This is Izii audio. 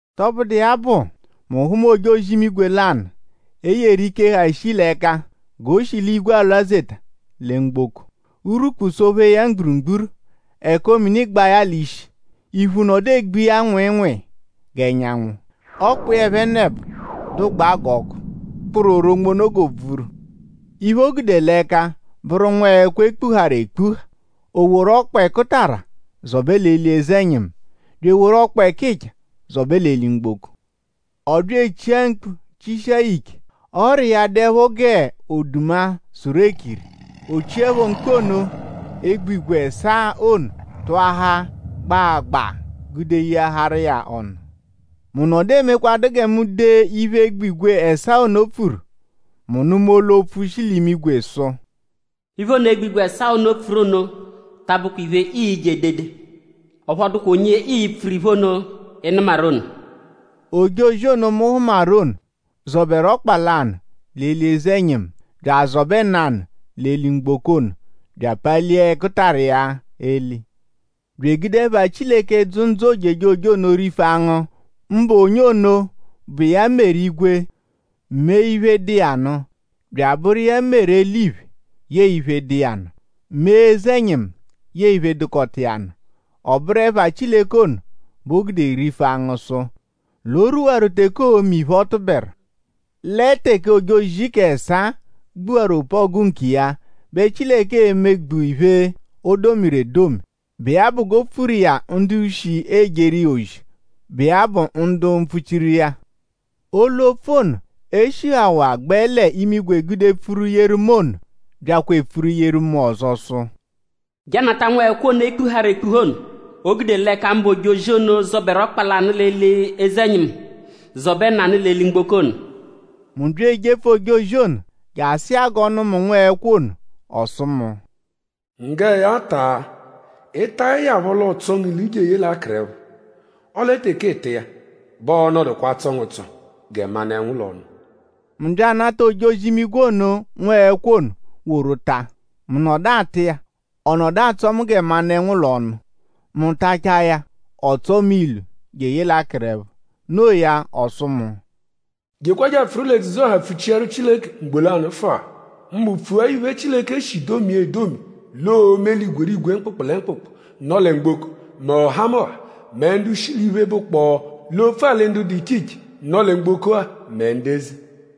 Tọbudu iya bụ; mu hụma ojozi-imigwe lanụ, e yeru ike, ha shii l'ẹka g'o shi l'igwe alwazeta lẹ mgboko; urwukpu sọ-phee ya mgburugburu. Ẹko-mini gbaa ya l'ishi. Iphu nọdu egbu iya nwịinwii g'ẹnyanwu. Ọkpa iya ẹphenebo dụgbaa g'ọku, kpụru oronmono g'òbvúrú. Iphe, o gude l'ẹka bụru nwẹekwo, e kpuharụ ekpuha. O woru ọkpa ẹkutara zọbe l'eli eze-ẹnyimu bya eworu ọkpa ẹkicha zọbe l'eli-mgboko. Ọ bya echia mkpu chishia ya ike. Ọ́rà iya dụepho g'oduma sụru ekiri. O chiẹpho mkpu ono egbigwe ẹsaa ono tụahaa gbaagbaa gude yeaharu iya ọnu. Mu nọdu emekwadụa gẹ mu dee iphe egbigwe ẹsaa ono pfuru; mu nụma olu-opfu, shi l'imigwe sụ: “Iphe ono, egbigwe ẹsaa ono pfuru ono ta abụkwa iphe, ii-je edede. Ọphu ọ dụkwa onye ii-pfuru iphe ono, ị nụmaru ono.” Ojozi ono, mu hụmaru ono, zọberu ọkpa lanụ l'eli eze-ẹnyimu bya azọbe nanụ l'eli-mgboko ono bya apalia ẹkutara iya eli; bya egude ẹpha Chileke, dzụ ndzụ ojejoje ono rifu angụ; mbụ onye ono, bụ iya meru igwe; mee iphe, dụ iya nụ; bya abụru iya meru eliphe yẹe iphe, dụ iya nụ; mee eze-ẹnyimu yẹe iphe, dụkota iya nụ. Ọ bụru ẹpha Chileke ono bẹ o gude rifu angụ sụ l'o rwuwaru teke oo-me iphe, ọ tụberu. Lẹ teke ojozi k'ẹsaa gbuwaru opu-ọgu nkiya bẹ Chileke e-megbu iphe, o domiru edomi, bụ iya bụ g'o pfuru iya ndu shi ejeru iya ozi, bụ iya bụ ndu mpfuchiru iya. Olu-opfu ono, e shihawaa gbẹ l'imigwe gude pfuru yeru mu ono byakwa epfuru yeru mu ọzo sụ: “Je anata nwẹekwo ono, e kpuharụ ekpuha ono, o gude l'ẹka mbụ ojozi ono, zọberu ọkpa lanụ l'eli eze-ẹnyimu; zọbe nanụ l'eli-mgboko ono.” Mu bya ejepfu ojozi ono je asụ iya g'ọ nụ mu nwẹekwo ono. Ọ sụ mu: “Nggẹ ya; taa. Ị -tachaẹ ya phọ l'ọo-tsọo ngu ilu jeye l'akụrepho. Ọle teke ịita iya bẹ ọo-nọdukwa atsọ ngu ụtso gẹ manụ-ẹnwu l'ọnu.” Mu bya anata ojozi-imigwe ono nwẹekwo ono woru taa. Mu nọdu ata iya; ọ nọdu atsọ mu gẹ manụ-ẹnwu l'ọnu. Mu tachaa ya; ọ tsọo mu ilu jeye l'akụrepho. No iya; ọ sụ mu: “Jekwa je apfụru l'edzudzu-ọha pfuchiaru Chileke ugbo lanụfua; mbụ pfua iphe, Chileke shi domia edomi l'oo-me l'igwerigwe mkpụkpu lẹ mkpụkpu, nọ lẹ mgboko; mẹ ọhamoha; mẹ ndu shi l'iphe, bụkpoo l'opfu-alị ndu dụ iche iche, nọ lẹ mgboko-a; mẹ ndu eze.”